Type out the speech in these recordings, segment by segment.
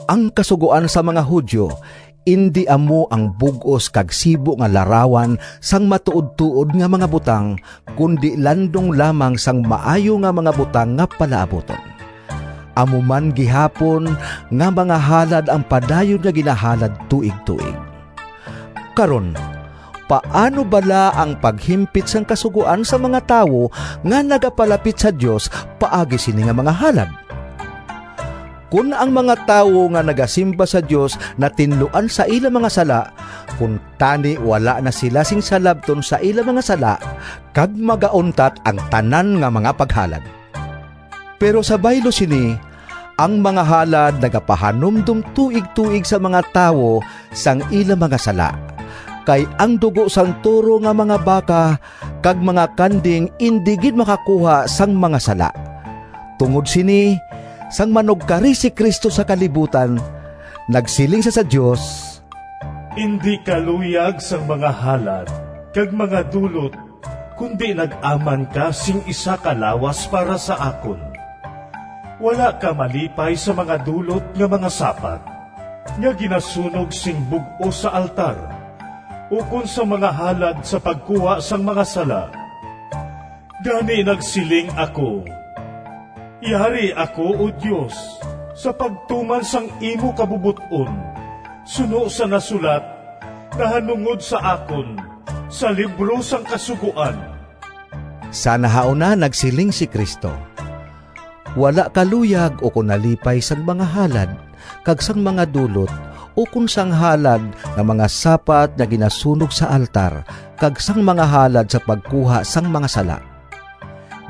Ang Kasugoan sang mga Judio indi amo ang bug-os kag sibo nga larawan sang matuodtuod nga mga butang, kundi landong lamang sang maayo nga mga butang nga palaabuton. Amo man gihapon nga mga halad ang padayon nga ginahalad tuigtuig. Karon paano bala ang paghimpit sang Kasugoan sang mga tawo nga nagapalapit sa Dios paagi sini nga mga halad? Kon ang mga tawo nga nagasimba sa Dios natinluan sa ila mga sala, kuntani wala na sila sing salabton sa ila mga sala, kag magauntat ang tanan nga mga paghalad. Pero sa baylo sini, ang mga halad nagapahanumdom tuigtuig sa mga tawo sang ila mga sala. Kay ang dugo sang toro nga mga baka kag mga kanding indi gid makakuha sang mga sala. Tungod sini, sang manugkari si Cristo sa kalibutan, nagsiling sia sa Dios: “Indi ka luyag Sang mga halad kag mga dulot Kundi nag-aman ka Sing isa ka lawas para sa akon. Wala ka malipay Sa mga dulot nga mga sapat Nga ginasunog sing bug-os sa altar, Ukon sang mga halad Sa pagkuha sang mga sala. Gani nagsiling ako, ‘Yari ako, O Dios, Sa pagtuman sang imo kabubot-on, Suno sa nasulat nahanungod sa akon Sa libro sang kasugoan.’” Sa nahauna, nagsiling si Cristo, “Wala ka luyag ukon nalipay sang mga halad kag sang mga dulot, ukon sang halad nga mga sapat nga ginasunog sa altar, kag sang mga halad sa pagkuha sang mga sala.”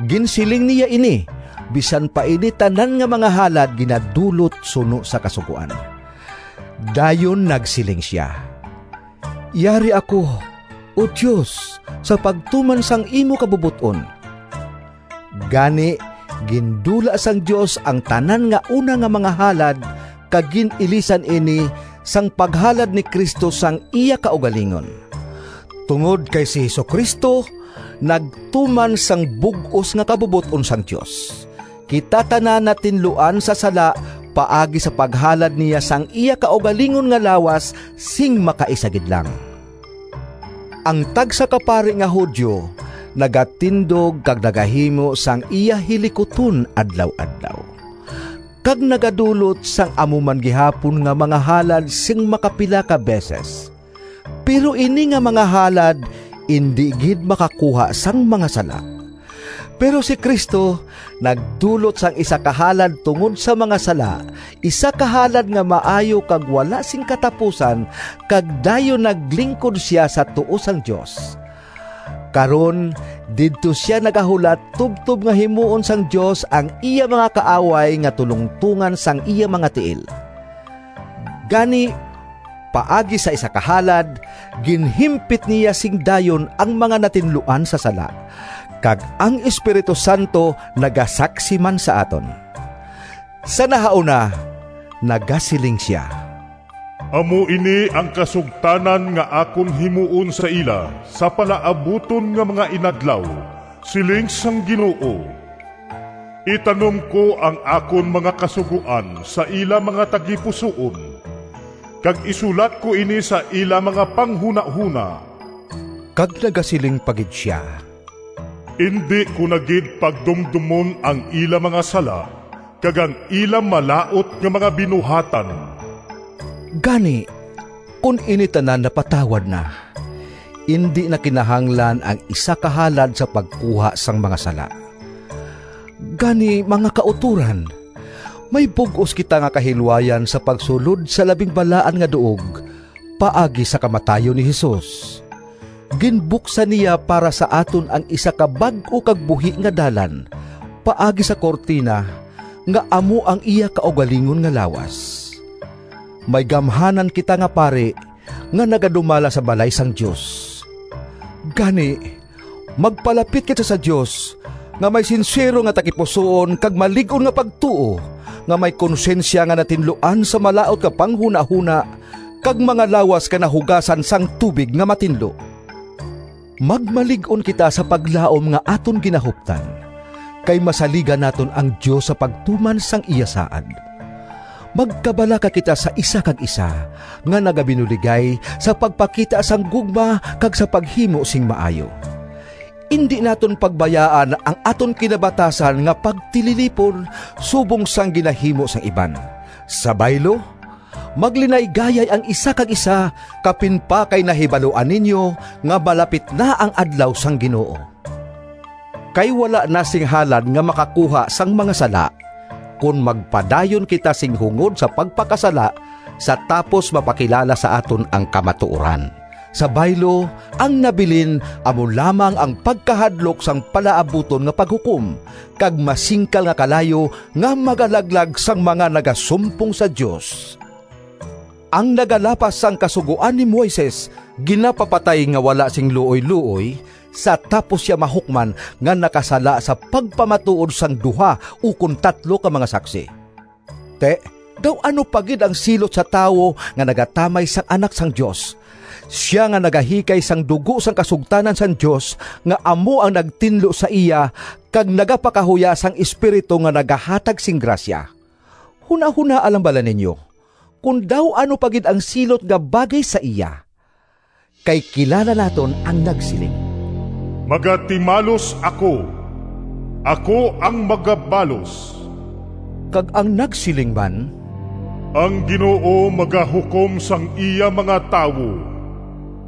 Ginsiling niya ini bisan pa ini tanan nga mga halad ginadulot suno sa Kasugoan. Dayon nagsiling sia, “Yari ako, O Dios, sa pagtuman sang imo kabubot-on.” Gani gindula sang Dios ang tanan nga una nga mga halad, kag gin-ilisan ini sang paghalad ni Cristo sang iya kaugalingon. Tungod kay si Jesu-Cristo nagtuman sang bug-os nga kabubot-on sang Dios, kita tanan natinluan sa sala paagi sa paghalad niya sang iya kaugalingon nga lawas sing makaisa gid lang. Ang tagsa ka pari nga Judio nagatindog kag nagahimo sang iya hilikuton adlaw-adlaw kag nagadulot sang amo man gihapon nga mga halad sing makapila ka beses. Pero ini nga mga halad indi gid makakuha sang mga sala. Pero si Cristo nagdulot sang isa ka halad tungod sa mga sala, isa ka halad nga maayo kag wala sing katapusan, kag dayon naglingkod sia sa tuo sang Dios. Karon didto sia nagahulat tubtob nga himuon sang Dios ang iya mga kaaway nga tulongtongan sang iya mga tiil. Gani paagi sa isa ka halad, ginhimpit niya sing dayon ang mga natinluan sa sala. Kag ang Espiritu Santo nagasaksi man sa aton. Sa nahauna nagasiling sia: “Amo ini ang kasugtanan Nga akon himuon sa ila Sa palaabuton nga mga inadlaw, Siling sang Ginoo: Itanom ko ang akon mga kasugoan Sa ila mga tagipusoon, Kag isulat ko ini Sa ila mga panghunahona.” Kag nagasiling pa gid sia, “Indi ko na gid pagdumdomon ang ila mga sala kag ang ila malaut nga mga binuhatan.” Gani kon ini tanan napatawad na, indi na kinahanglan ang isa ka halad sa pagkuha sang mga sala. Gani, mga kautoran, may bug-os kita nga kahilwayan sa pagsulod sa Labing Balaan nga Duog paagi sa kamatayon ni Jesus. Ginbuksan niya para sa aton ang isa ka bag-o kag buhi nga dalan, paagi sa kurtina, nga amo ang iya kaugalingon nga lawas. May gamhanan kita nga pari nga nagadumala sa balay sang Dios. Gani magpalapit kita sa Dios, nga may sinsero nga tagipusoon kag malig-on nga pagtuo, nga may konsyensya nga natinluan sa malaut nga panghunahona, kag mga lawas nga nahugasan sang tubig nga matinlo. Magmalig-on kita sa paglaom nga aton ginahuptan, kay masaligan naton ang Dios sa pagtuman sang iya saad. Magkabalaka kita sa isa kag isa, nga nagabinuligay sa pagpakita sang gugma kag sa paghimo sing maayo. Indi naton pagbayaan ang aton kinabatasan nga pagtililipon, subong sang ginahimo sang iban. Sa baylo, maglinaygayay ang isa kag isa, kapin pa kay nahibaluan ninyo nga malapit na ang Adlaw sang Ginoo. Kay wala na sing halad nga makakuha sang mga sala, kon magpadayon kita sing hungod sa pagpakasala sa tapos mapakilala sa aton ang kamatuoran. Sa baylo, ang nabilin amo lamang ang pagkahadlok sang palaabuton nga Paghukom kag masingkal nga kalayo nga magalaglag sang mga nagasumpong sa Dios! Ang nagalapas sang Kasugoan ni Moises ginapapatay nga wala sing luoyluoy, sa tapos sia mahukman nga nakasala sa pagpamatuod sang duha ukon tatlo ka mga saksi. Ti, daw ano pa gid ang silot sa tawo nga nagatamay sang Anak sang Dios—sia nga nagahikay sang dugo sang kasugtanan sang Dios nga amo ang nagtinlo sa iya, kag nagapakahuya sang Espiritu nga nagahatag sing grasya. Hunahonaa lang bala ninyo kon daw ano pa gid ang silot nga bagay sa iya! Kay kilala naton ang nagsiling, “Magatimalos ako, ako ang magabalos,” kag ang nagsiling man, “Ang Ginoo magahukom sang iya mga tawo.”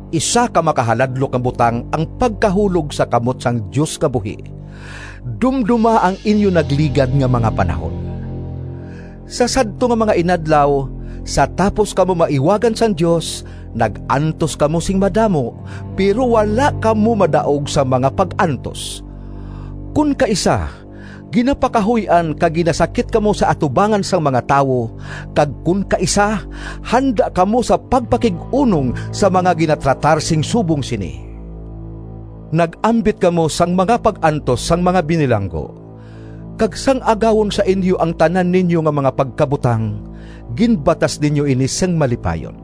Isa ka makahaladlok nga butang ang pagkahulog sa kamot sang Dios nga buhi! Dumdoma ang inyo nagligad nga mga panahon. Sa sadto nga mga inadlaw, sa tapos kamo maiwagan sang Dios, nag-antos kamo sing madamo, pero wala kamo madaog sang mga pag-antos. Kon kaisa ginapakahuy-an kag ginasakit kamo sa atubangan sang mga tawo, kag kon kaisa handa kamo sa pagpakig-unong sa mga ginatratar sing subong sini. Nag-ambit kamo sang mga pag-antos sang mga binilanggo, kag sang agawon sa inyo ang tanan ninyo nga mga pagkabutang ginbatas ninyo ini sing malipayon,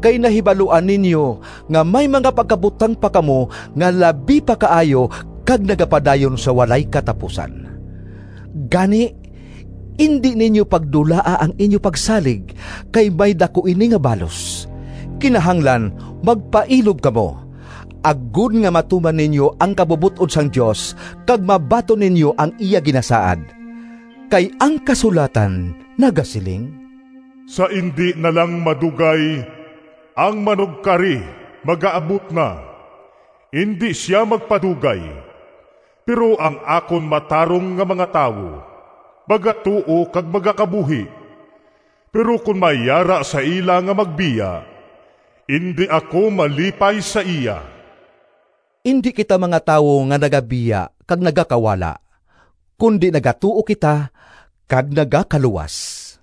kay nahibaluan ninyo nga may mga pagkabutang pa kamo nga labi pa kaayo kag nagapadayon sa walay katapusan. Gani indi ninyo pagdulaa ang inyo pagsalig, kay may daku ini nga balos. Kinahanglan magpailob kamo, agod nga matuman ninyo ang kabubot-on sang Dios kag mabaton ninyo ang iya ginasaad. Kay ang kasulatan nagasiling: “Sa indi na lang madugay, Ang manugkari magaabot na, Indi sia magpadugay. Pero ang akon matarong nga mga tawo Magatuo kag magakabuhi, Pero kon may yara sa ila Nga magbiya, Indi ako malipay sa iya.” Indi kita mga tawo nga nagabiya kag nagakawala, kundi nagatuo kita kag nagakaluwas.